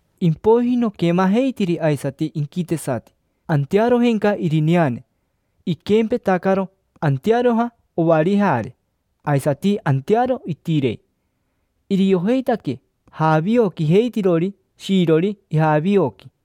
Impoiji noquemajeitiri aisati inquitesati, antearojenca irineane; iquempetacaro antearoja ovarijare, aisati antearo itirei. Iriojeitaque javioquijeitirori shiirori ijavioqui.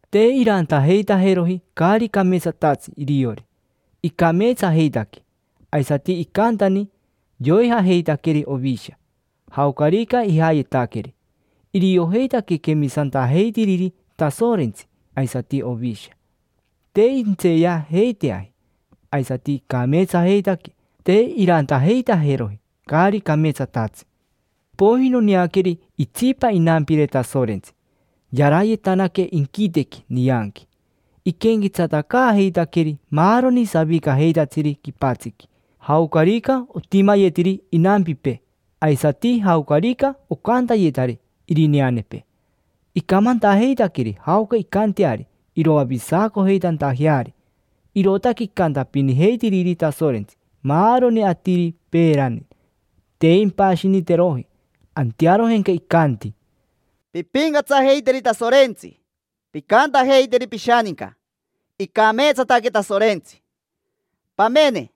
Te irantajeitajeroji caari cameetsatatsi iriori, icameetsajeitaque: aisati icantani yoijajeitaqueri ovisha, jaocarica ijayetaqueri. Iriojeitaque quemisantajeitiriri Tasorentsi aisati Ovisha. Te intseeyajeiteaji, aisati icameetsajeitaque, te irantajeitajeroji caari cameetsatatsi. Impoiji noneaqueri itsipa inampire Tasorentsi, yarayetanaque inquitequi nianqui. Iquenquetsatacaajeitaqueri maaroni savicajeitatsiri quipatsiqui, jaocarica otimayetiri inampipee, aisati jaocarica ocantayetari irineanepee. Icamantajeitaqueri jaoca incanteari iroavisacojeitantajeari. Irootaque icantapinijeitiriri Tasorentsi maaroni atiri peerani, te impashiniteroji. Antearojenca icanti: —Pimpincatsajeiteri Tasorentsi, pincantajeiteri pishaninca: “Icameetsataque Tasorentsi”. Pamene,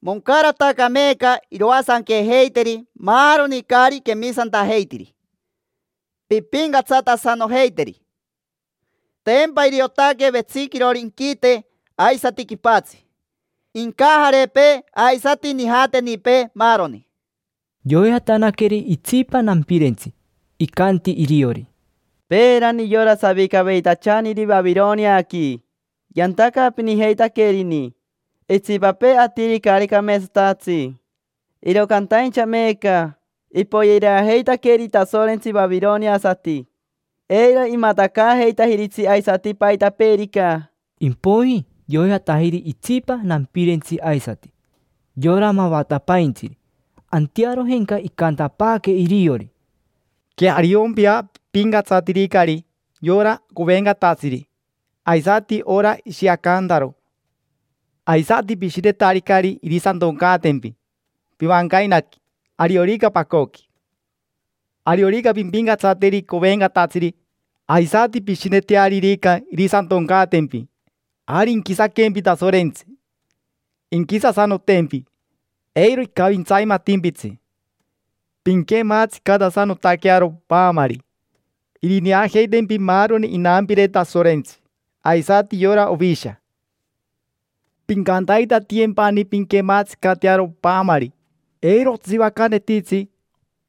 moncarataca meeca iroasanquejeiteri maaroni caari quemisantajeitiri. Pimpincatsatasanojeiteri: tempa iriotaque vetsiquirori inquite aisati quipatsi, incajarepee aisati nijatenipee, maaroni. Yoijatanaqueri itsipa nampirentsi, icanti iriori: —Peerani yora savicaveitachaniri Vavironiaqui yantacaapinijeitaquerini itsipapee atiri caari cameetsatatsi, iro cantaincha meeca ipoyereajeitaqueri Tasorentsi vavironiasati. Eiro imatacaajeitajiritsi aisati paitapeerica. Impoiji yoijatajiri itsipa nampirentsi aisati: yora mavatapaintsiri. Antearojenca icantapaaque iriori: —Queariompia, pipincatsatiricari yora covencatatsiri, aisati ora ishiacantaro. Aisati pishinetaricari irisatoncaatempi pivancainaqui, ariorica pacoqui. Ariorica pimpincatsateri covencatatsiri aisati pishinetearirica irisatoncaatempi, ari inquisaquempi Tasorentsi; inquisasanotempi, eiro icavintsaimatimpitsi. Pinquematsicatasanotaquearo paamari, irineajeitempi maaroni inampire Tasorentsi aisati yora Ovisha. Pincantaitatiyempani pinquematsicatearo paamari; eiro otsivacanetitsi,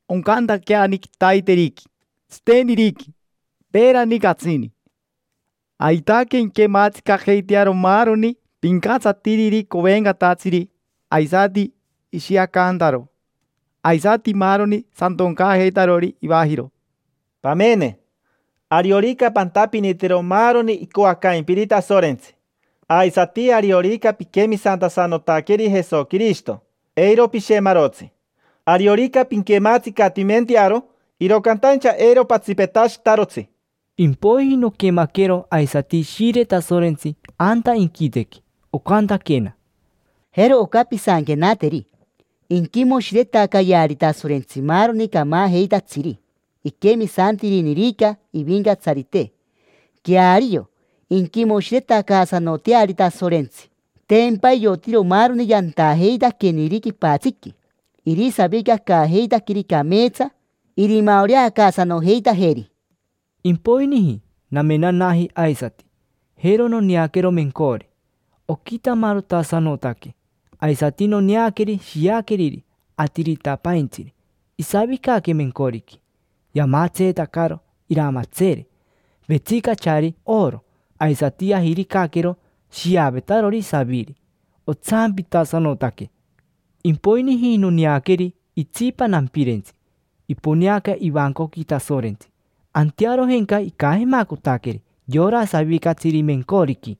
oncantaqueani: quitaiteriqui, tsiteniriqui, peerani catsini. Aitaque inquematsicajeitearo maaroni pincatsatiriri covencatatsiri aisati ishiacantaro, aisati maaroni satoncaajeitarori ivajiro. Pamene, ariorica pantapinitiro maaroni icoacaimpiri Tasorentsi, aisati ariorica piquemisantasanotaqueri Jesoquirishito, eiro pishemarotsi; ariorica pinquematsicatimentearo, iro cantaincha eiro patsipetashitarotsi. Impoiji noquemaquero aisati Ishire Tasorentsi anta inquitequi, ocantaquena: —Jero oca pisanquenateri: “Inquimoshiretacayeari Tasorentsi maaroni camajeitatsiri, iquemisantirinirica Ivincatsarite. Queario, inquimoshiretacaasanoteari Tasorentsi, tempa iotiro maaroni yantajeitaqueniri quipatsiqui; irisavicacaajeitaqueri cameetsa, irimaoreacaasanojeitajeri”. Impoiniji namenanaji aisati, jero noneaquero mencori, oquitamarotasanotaque. Aisati noneaqueri shiaqueriri Atiritapaintsiri, isavicaque mencoriqui. Yamatseetacaro iramatseere, vetsicachari oro. Aisati yajiricaquero shiavetarori saviri, otsampitasanotaque. Impoiniji noneaqueri itsipa nampirentsi, iponeaca ivancoqui Tasorentsi. Antearojenca icajemacotaqueri yora savicatsiri mencoriqui: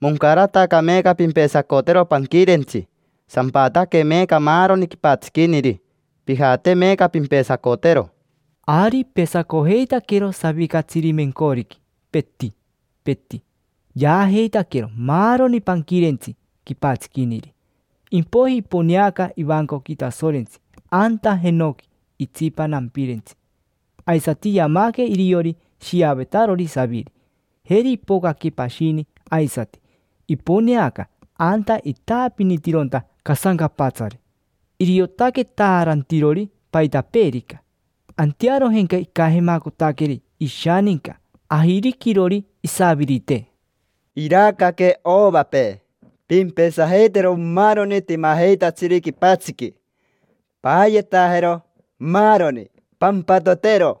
—Moncarataca meeca pimpesacotero panquirentsi, sampataque meeca maaroni quipatsiquiniri. Pijate meeca pimpesacotero. Ari ipesacojeitaquero savicatsiri mencoriqui, peti, peti; yaajeitaquero maaroni panquirentsi quipatsiquiniri. Impoiji iponeaca ivancoqui Tasorentsi anta jenoqui itsipa nampirentsi. Aisati yamaque iriori shiavetarori saviri. Jeri ipocaque pashini aisati, iponeaca anta itaapinitironta casancapatsari. Iriotaque taarantirori paitapeerica. Antearojenca icajemacotaqueri ishaninca ajiriquirori isavirite: —Iracaque ovapee: pimpesajeitero maaroni timajeitatsiri quipatsiqui, paayetajero maaroni, pampatotero.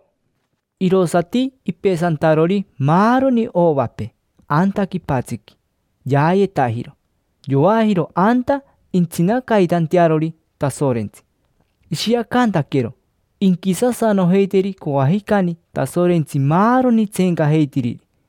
Irosati ipesantarori maaroni ovapee anta quipatsiqui, yaayetajiro, yoajiro anta intsinacaitantearori Tasorentsi: ishiacantaquero inquisasanojeiteri coajicani Tasorentsi maaroni tseencajeitiriri.